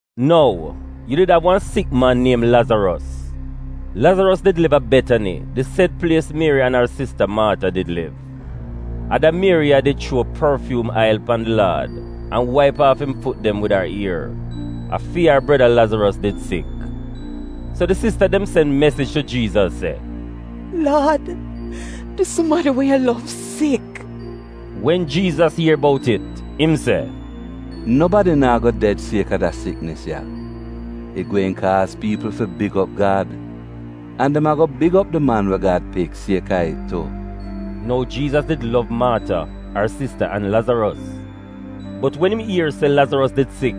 Nou, yu did av wan sik man niem Lazaros. Lazaros did liv a Betani, di sed plies Mieri an ar sista, Maata, did liv. (A da Mieri ya did chuo porfyuum ail pan di Laad an waip aaf im fut dem wid ar ier. A fi ar breda Lazaros did sik.) So di sista dem sen mesij tu Jiizas se, “Laad, di sumadi we yu lov sik.” Wen Jiizas ier bout it, im se, “Nobadi naa go ded sieka da siknis ya. It gweehn kaaz piipl fi big op Gad. An dem ago big op di Man we Gad Pik sieka it tu.” (Nou Jiizas did lov Maata, ar sista an Lazaros.) Bot wen im ier se Lazaros did sik,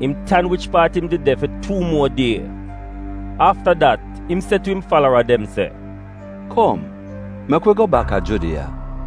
im tan wich paat im did de fi tuu muo die. Afta dat, im se tu im falara dem se, “Kom mek wi go bak a Judiya.”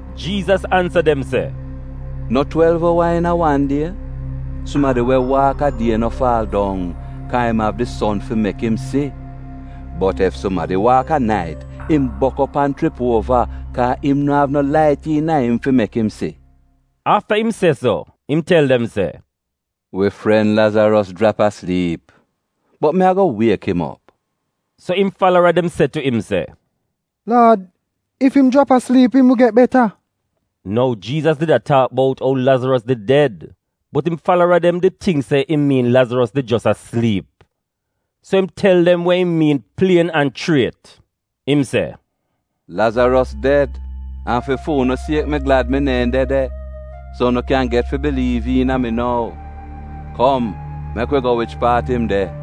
Jiizas ansa dem se, “No twelv owa iina wan die? Sumadi we waak a die no faal dong, kaa im av di son fi mek dem si. Bot ef sumadi waak a nait, im bok op an chrip uova, kaa im no av no lait iina im fi mek im si.” Afta im se so, im tel dem se, “Wi fren Lazaros jrap asliip; bot mi ago wiek im op.” So im falara dem se tu im se, “Laad, ef im jrap asliip, im get beta.” (Nou, Jiizas did a taak bout ou Lazaros did ded, bot im falara dem did tingk se im miin Lazaros did jos a sliip.) So im tel dem we im miin plien an chriet, im se, “Lazaros ded, an fi fu'unu siek, mi glad mi neehn de de, so unu kyan get fi biliiv iina mi nou. Kom mek wi go wich paat im de.”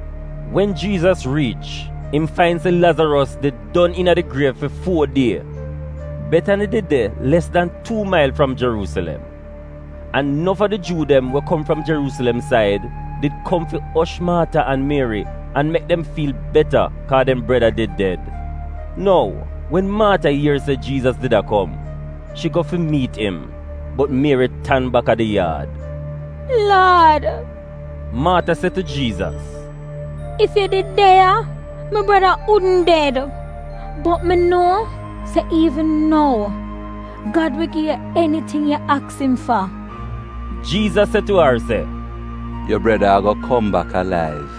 Wen Jiizas riich, im fain se Lazaros did don iina di griev fi fuo die. (Betani did de les dan tuu mail fram Jeruusilem, an nof a di Juu dem kom fram Jeruusilem said did kom fi osh Maata an Mieri an mek dem fiil beta kaa dem breda did ded.) Nou, wen Maata ier se Jiizas did a kom, shi go fi miit im, bot Mieri tan bak a di yaad. “Laad,” Maata se tu Jiizas, “ef yu did de ya, mi breda wudn ded. Bot mi nuo se iivn nou Gad wi gi yu eniting yu aks im fa.” Jiizas se tu ar se, “Yu breda ago kom bak alaiv.”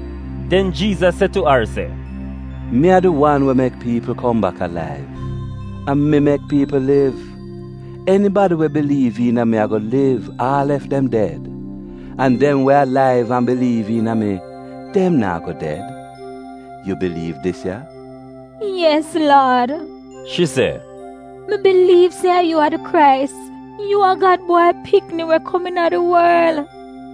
Den Jiizas se tu ar se, “Mi a di wan we mek piipl kom bak alaiv; a mi mek piipl liv. Enibadi we biliiv iina mi ago liv, aal ef dem ded. An dem we alaiv an biliiv iina mi, dem naa go ded. Yu biliiv dis ya?” “Yes, Laad,” shi se, “mi biliiv se yu a di Krais, yu a Gad Bwai Pikni we kom iina di worl.”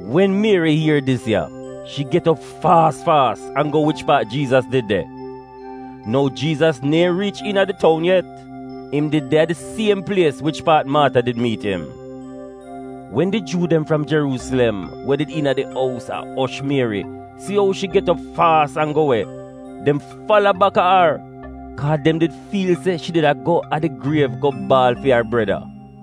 Wen Mieri ier dis ya, shi get op faas faas an go wich paat Jiizas did de. (Nou Jiizas neehn riich iina di toun yet; im did de a di siem plies wich paat Maata did miit im.) Wen di Juu dem fram Jeruusilem we did iina di ous a osh Mieri si ou shi get op faas an go we, dem fala baka ar, kaa dem did fiil se shi did a go a di griev go baal fi ar breda.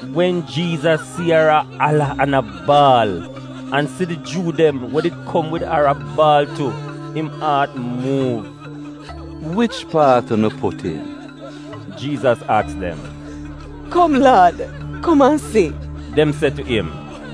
Wen Jiizas si ar a ala an a baal, an si di Juu dem we did kom wid ar a baal tu, im aat muuv. “Wich paat unu put im?” Jiizas aks dem. “Kom, Laad, kom an si,” dem se tu im.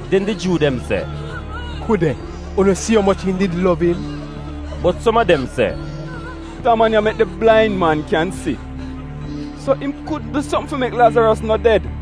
Den di Juu dem se, “Ku de, unu si umoch im did lov im!” Bot som a dem se, “Da man ya mek di blain man kyan si. So, im kudn du sopm fi mek Lazaros no ded?”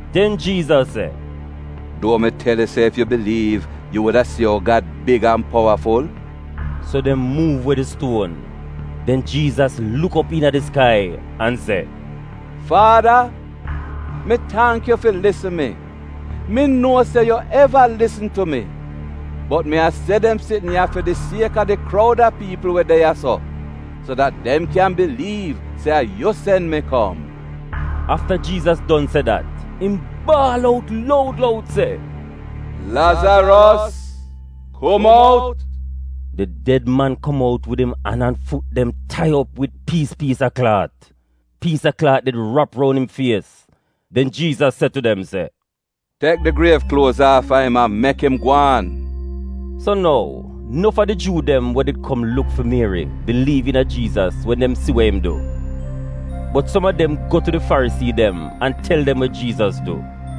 Den Jiizas se, “Duohn mi tel yu se ef yu biliiv, yu wuda si ou Gad big an powaful?” So dem muuv we di stuon. Den Jiizas luk op iina di skai an se, “Faada, mi tangk yu fi lisn mi. Mi nuo se yu eva lisn tu mi, bot mi a se dem sitn ya fi di sieka di kroud a piipl we de ya-so, so dat dem kyan biliiv se a yu sen mi kom.” Afta wen Jiizas don se dat, im baal out loud loud se, “Lazaros, kum out!” Di ded man kom out wid im an an fut dem tai op wid piis piis a klaat. Piis a klaat did rap roun im fies. Den Jiizas se tu dem se, “Tek di griev kluoz aafa im an mek im gwaan.” So nou, nof a di Juu dem we did kom luk fi Mieri biliiv iina Jiizas wen dem si we im du. Bot som a dem go tu di Farisii dem an tel dem we Jiizas du.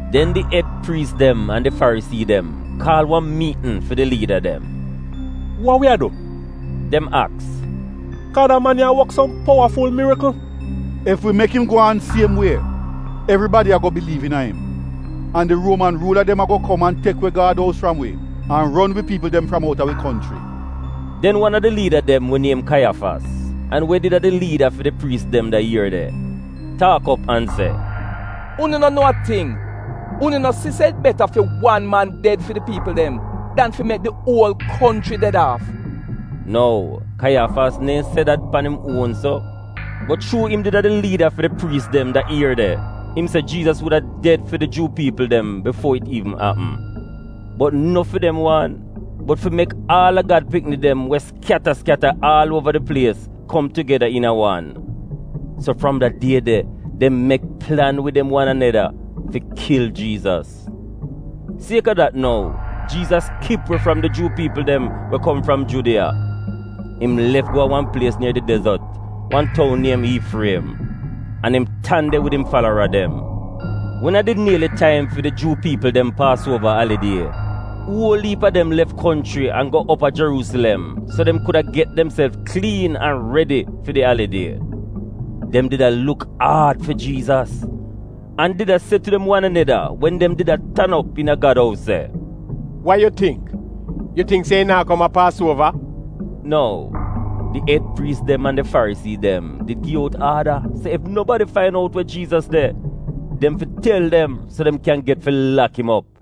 Den di ed priis dem an di Farisii dem kaal wan miitn fi di liida dem. “Wa wi a du?” dem aks. “Kaa da man ya a wok som powaful mirikl? Ef wi mek im gwaan siem wie, evribadi ago biliiv iina im, an di Ruoman ruula dem ago kom an tek we Gad ous fram wi an ron wi piipl dem fram outa wi konchri.” Den wan a di liida dem we niem Kaiyafas, an we did a di liida fi di priis dem da ier de, taak op an se, “Unu no nuo a ting!” Unu no si se it beta fi wan man ded fi di piipl dem dan fi mek di uol konchri ded aaf?” (Nou, Kaiyafas neehn se dat pan im uon so, bot chuu im did a di liida fi di priis dem da ier de, im se Jiizas wuda ded fi di Juu piipl dem bifuor it iivn apm. Bot no fi dem wan, bot fi mek aal a Gad pikni dem we skyata skyata aal uova di plies kom tugeda iina wan.) So fram da die de, dem mek plan wid dem wan aneda fi kil Jiizas. Sieka dat nou, Jiizas kip we fram di Juu piipl dem we kom fram Judiya. Im lef go a wan plies nier di dezot, wan toun niem Iifriem. An im tan de wid im falara dem. Wen a did nieli taim fi di Juu piipl dem Paasuova Alidie, uol iip a dem lef konchri an go op a Jeruusilem so dem kuda get demself kliin an redi fi di alidie. Dem did a luk aad fi Jiizas, an did a se tu dem wan aneda wen dem did a tan op iina Gad ous se, “Wa yu tingk? Yu tingk se im naa kom a Paasuova?” (Nou, di ed priis dem an di Farisii dem did gi out aada se ef nobadi fain out we Jiizas de, dem fi tel dem so dem kyan get fi lak im op.)